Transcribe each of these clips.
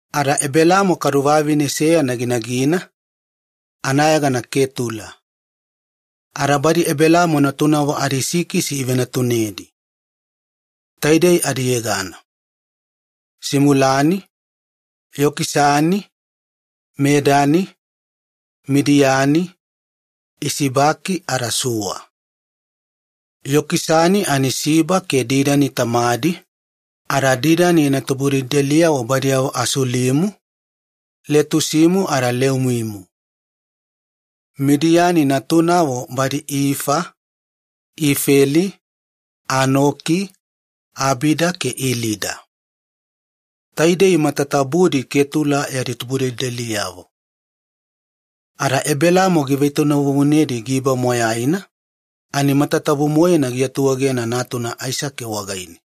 Ada Ebelaamo vavine velugana ginagina, anayegana Ketula. Ada badi Ebelaamo natunavo adisikisi ivenatunedi. Taidei adiyegana: Simulani, Yokisani, Medani, Midiani, Isibaki ada Suwa. Yokisani Siba ke Didani tamadi, ada Didani yana tubudelideliyavo badiyavo Asulimu, Letusimu ada Leumimu. Midiani natunavo badi Ifa, Ifeli, Anoki, Abida ke Ilida. Taidei matatabudi Ketula yadi tubudelideliyavo. Ada Ebelaamo givetoinavuvunedi giba moyaina ani matatabu-moena giatuegena natuna Aisake wagaine.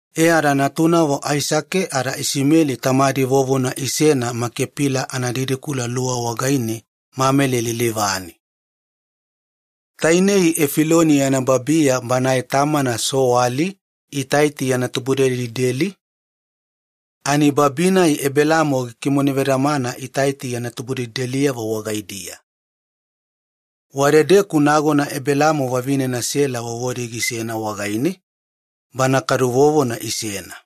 E ada natunavo Aisake ada Isimeli tamadi vovona isena Makepila analuwa wagaine Mamele lilivane. Tainei Efiloni yana babiya banae tamana Soali Itaiti yana tubudelideli, ani babi-nai Ebelaamo gikimonevedamana Itaiti yana tubudelideliyavo wagaidiya. Wadedeku nagona Ebelaamo vavinena Sela vovodi gisena wagaine, bana kadu vovona isena.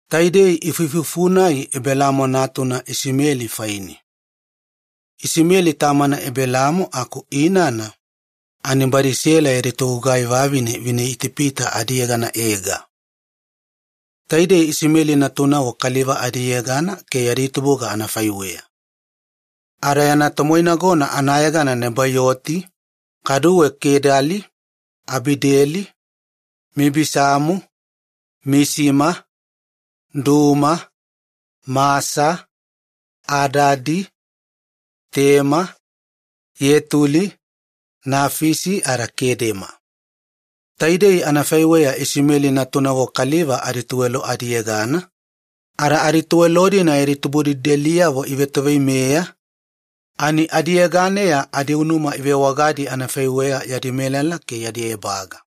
Taidei ifuifufu-nai Ebelaamo natuna Isimeli faine. Isimeli tamana Ebelaamo aku inana ani badi Sela yadi togugai vavine vineItipita adiyegana Ega. Taidei Isimeli natunavo kaliva adiyegana ke yadi tubuga anafaiweya. Ada yana tomoinagona anayegana Nebaioti, kaduwe Kedali, Abideli, Mibisamu, Misima, Duma, Masa, Adadi, Tema, Yetuli, Nafisi ada Kedema. Taidei anafaiweya Isimeli natunavo kaliva adituwelo adiyegana, ada adituwelo-dina yadi tubudelideliyavo ivetoveimeya ani adiyeganeya adiunuma ivewagadi anafaiweya yadi melala ke yadi ebaga.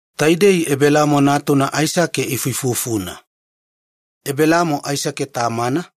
Taidei Ebelaamo natuna Aisake ifuifufuna. Ebelaamo Aisake tamana,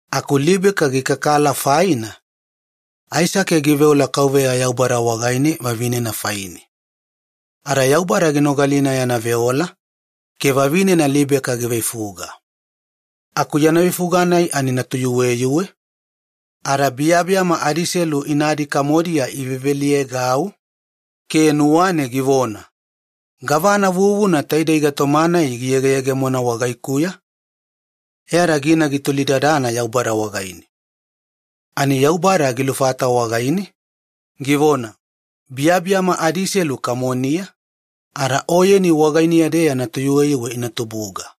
Aku Libeka gikakala faina, Aisake giveola Yaubada wagaine vavinena faine. Ada Yaubada ginogalina yana veola, ke vavinena Libeka giveifuga. Aku yana veifuga-nai ani natuyuweyuwe, ada biyabiyama adiselu inadi kamodiya iveveliyaegau ke nuwane givona, “Gavana vuvuna taidei gaitoma-nai giyegeyegemona wagaikuya?” E ada gina gitolidadana Yaubada wagaine. Ani Yaubada gilufata wagaine, givona, “Biyabiyama adiselu kamoniya, ada oyeni wagainiya-deya natuyuweyuwe ina tubuga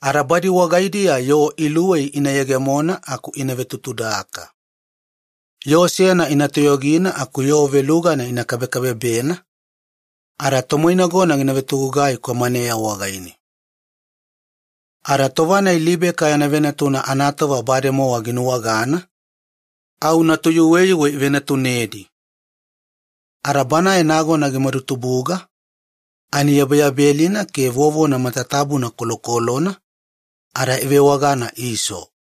ke badi wagaidiya yoo luwei ina yegemona ada ina vetutudaka. Yoo seyana ina toyogina ada yoo velugana ina kabekabebena, ke tomoinagona gina vetogugai kwamaneya wagaine.” Ada tova-nai Libeka yana venatuna anatova bademowa ginuwagana, au natuyuweyuwe ivenatunedi. Ada banae nagona gimadutubuga ani yabeyabelina ke vovona matatabuna kolokolona, ada ivewagana 'Iso'.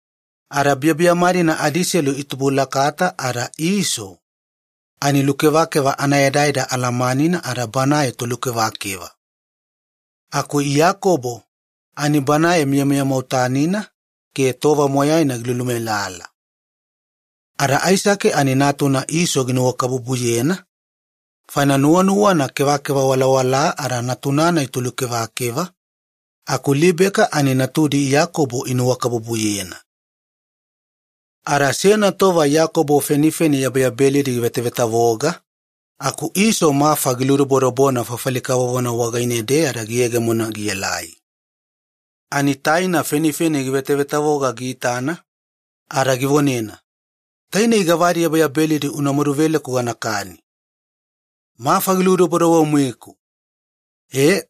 Ada biyabiyama-dina adiselu itubulakata, ada Iso ani lukevakeva anaedaeda alamanina ada banae tolukevakeva. Aku Iyakobo ani banae miyamiya mwautanina ke tova moyaina gilulumelala. Ada Aisake, ani Iso ginuwakabubuyena faina nuwanuwana kevakeva walawalaa ada natuna-nai tolukevakeva, aku Libeka ani natudi Iyakobo inuwakabubuyena. Ada seyana tova Iyakobo fenifeni yabeyabelidi givetavetavoga aku Iso mafa giludobodobona fafali kavovona wagaine-deya giyegemona gielai. Ani taina fenifeni givetavetavoga giitana ada givonena, “Tainei gavadi yabeyabelidi una maduveleku ganakani. Mafa giludobodobo-moeku!” E,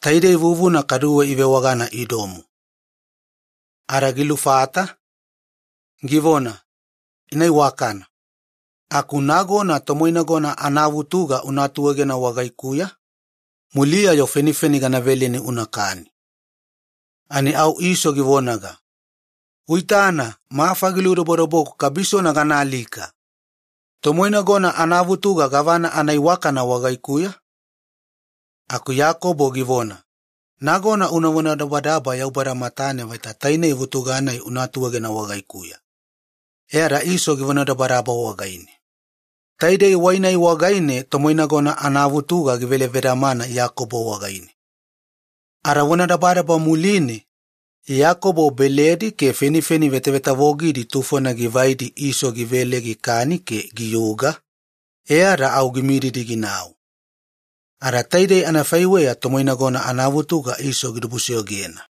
taidei vuvuna kaduwe ivewagana Idomu. Ada gilufata, givona, “Ina iwakana, aku nagona tomoinagona anavutuga una atuegena wagaikuya, muliya-yo fenifeni gana veleni unakani.” Ani au Iso givonaga, “Uitana mafa giludobodoboku kabisona ganaalika! Tomoinagona anavutuga gavana anaiwakana wagaikuya?” Aku Iyakobo givona, “Nagona una vonadabadaba Yaubada matane vaita tainei vutuga-nai una atuegena wagaikuya.” E ada Iso givonadabadaba wagaine. Taidei wai-nai wagaine tomoinagona anavutuga givelevedamana Iyakobo wagaine. Ada vonadabadaba muline, Iyakobo beledi ke fenifeni vetavetavogidi tufona givaidi Iso givele gikani ke giyuga, e ada au gimididi ginau. Ada taidei anafaiweya tomoinagona anavutuga Iso gidibusoyogena.